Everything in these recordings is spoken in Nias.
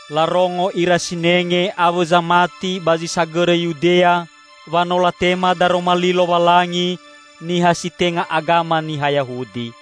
Larongo ira sinenge awõ zamati ba zi sagõrõ Yudea wa no latema Daroma Li Lowalangi niha si tenga agama niha Yahudi.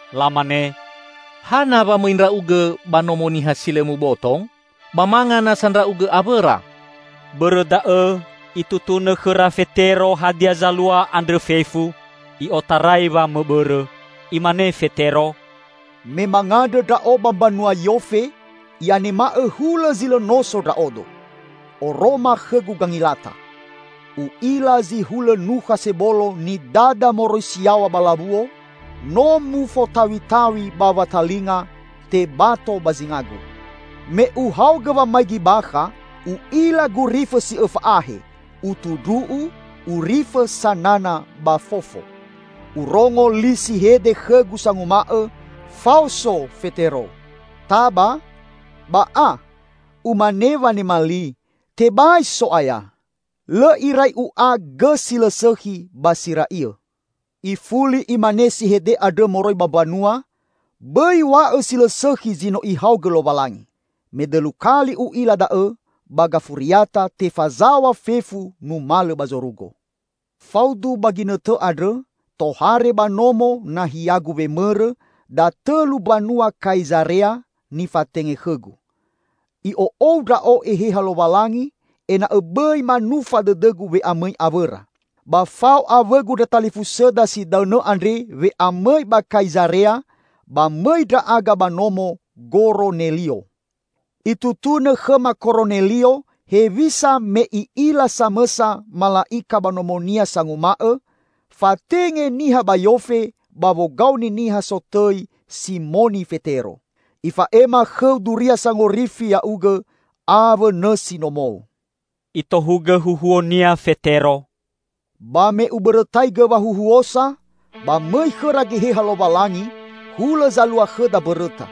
Lamane, "Hana wa mõi ndra'ugõ ba nomo niha si lõ muboto? Ba manga nasa ndra'ugõ awõra!" Bõrõ da'õ itutunõ khõra Fetero hadia zalua andrõ fefu, i'otarai wamõbõrõ. Imane Fetero, "Me mangandrõ ndra'o ba mbanua Yofe, i'anema'õ hulõ zi lõ noso ndra'odo. Oroma khõgu gangilata. U'ila zi hulõ nukha sebolo nidada moroi si yaw̃a ba lawuo, no mufotaw̃itaw̃i ba watalinga, tebato ba zingagu. Me uhaogõ wamaigi bakha, u'ila gurifõ si õfa ahe, utu ndru'u, urifõ sanana ba fofo. Urongo li si hede khõgu sanguma'õ, 'Faoso, Fetero! Taba, ba a!' Umane wanema li, 'Tebai So'aya! Lõ irai u'a gõ si lõ sõkhi ba si ra'iõ.' Ifuli imane si hede andrõ moroi ba mbanua, 'Bõi w̃a'õ si lõ sõkhi zi no Ihaogõ Lowalangi.' Medõlu kali u'ila da'õ ba gafuriata tefazaw̃a fefu numalõ ba zorugo. Faudu ba ginõtõ andrõ, tohare ba nomo nahiagu wemõrõ datõlu mbanua Kaizarea, nifatenge khõgu. I'o'ou ndra'o Eheha Lowalangi ena'õ bõi manufa dõdõgu we'amõi awõra. Ba fao awõgu ndra talifusõda si daõnõ andre we'amõi ba Kaizarea, ba mõi ndra'aga ba nomo Goronelio. Itutunõ khõma Koronelio hewisa me i'ila samõsa mala'ika ba nomonia sanguma'õ, 'Fatenge niha ba Yofe ba wogaoni niha sotõi Simoni Fetero. Ifa'ema khõu duria sangorifi ya'ugõ awõ nõsi nomou.'" Itohugõ huhuonia Fetero, "Ba me ubõrõtaigõ wahuhuosa, ba mõi khõra Geheha Lowalangi hulõ zalua khõda mbõrõta.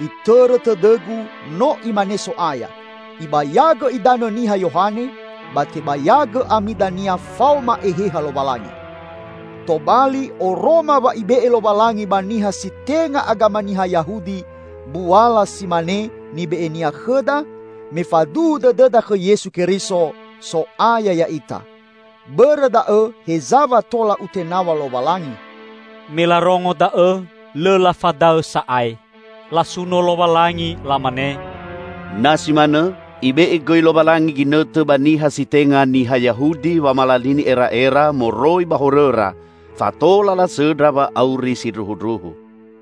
Itõrõ tõdõgu, no Imane So'aya, 'Ibayagõ idanõ niha Yohane, ba tebayagõ ami dania faoma Eheha Lowalangi.' Tobali oroma wa Ibe'e Lowalangi ba niha si tenga agama niha Yahudi mbuala si mane nibe'e-Nia khõda me faduhu dõdõda khõ Yesu Keriso, So'aya ya'ita. Bõrõ da'õ heza wa tola utenaw̃a Lowalangi!" Me larongo da'õ, lõ lafadaõ sa'ae. Lasuno Lowalangi, lamane, "Na si manõ, Ibe'e gõi Lowalangi ginõtõ ba niha si tenga niha Yahudi wamalalini era'era moroi ba horõra fa tola lasõndra wa'auri sindruhundruhu."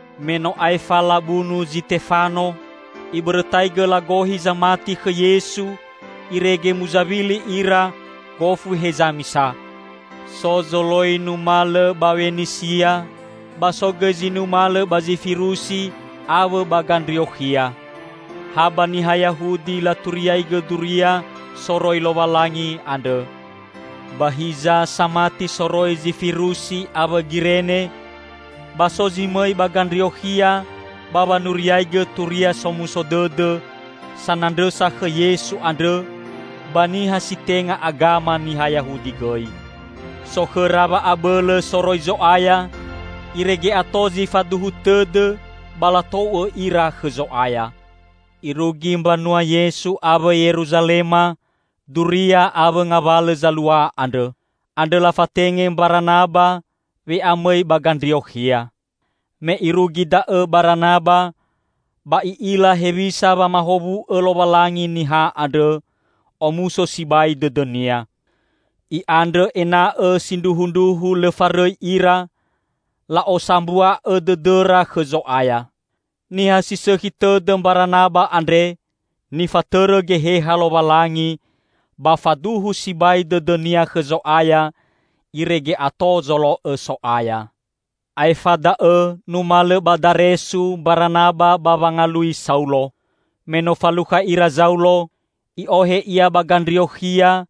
Me no aefa labunu Zitefano, ibõrõtaigõ lagohi zamati khõ Yesu irege muzawili ira gofu heza misa. So zoloi numalõ ba Wenisia, ba so gõi zi numalõ ba Zifirusi awõ ba Gandriokhia. Ha ba niha Yahudi laturiaigõ Duria soroi Lowalangi andrõ. Ba hiza samati soroi Zifirusi awõ Girene, ba so zi mõi ba Gandriokhia ba wanuriaigõ Turia Somuso Dõdõ sanandrõsa khõ Yesu andrõ ba niha si tenga agama niha Yahudi gõi. So khõra wa'abõlõ soroi Zo'aya irege ato zi faduhu tõdõ ba latou'õ ira khõ Zo'aya. Irugi mbanua Yesu awõ Yeruzalema duria awõ ngawalõ zalua andrõ. Andrõ lafatenge Mbaranaba we'amõi ba Gandriokhia. Me irugi da'õ Baranaba, ba i'ila hewisa wamahowu'õ Lowalangi niha andrõ, omuso sibai dõdõnia. I'andrõ ena'õ sindruhundruhu lõ farõi ira, la'osambua'õ dõdõra khõ Zo'aya. Niha si sõkhi tõdõ Mbaranaba andre, nifatõrõ Geheha Lowalangi ba faduhu sibai dõdõnia khõ Zo'aya irege ato zolo'õ So'aya. Aefa da'õ numalõ ba Daresu Mbaranaba ba wangalui Saulo. Me no falukha ira Zaulo, i'ohe ia ba Gandriokhia,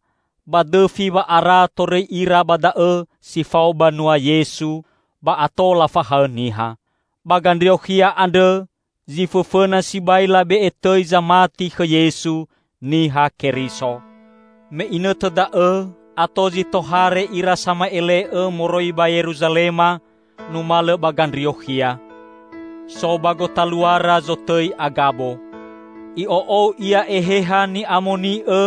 ba dõfi wa'ara torõi ira ba da'õ si fao banua Yesu, ba ato lafahaõ niha. Ba Gandriokhia andrõ zi fõfõna sibai labe'e tõi zamati khõ Yesu: Niha Keriso. Me inõtõ da'õ ato zi tohare ira sama'ele'õ moroi ba Yeruzalema numalõ ba Gandriokhia. So ba gotaluara zotõi Agabo. I'o'ou ia Eheha Ni'amoni'õ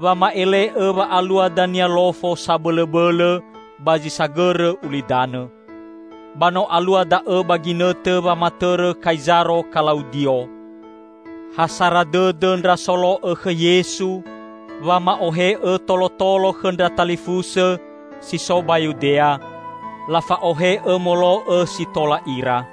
wama'ele'õ wa alua dania lofo sabõlõbõlõ ba zi sagõrõ ulidanõ. (Ba no alua da'õ ba ginõtõ wamatõrõ Kaizaro Kalaudio.) Ha sara dõdõ ndra solo'õ khõ Yesu wama'ohe'õ tolotolo khõ ndra talifusõ si so ba Yudea; lafa'ohe'õ molo'õ si tola ira.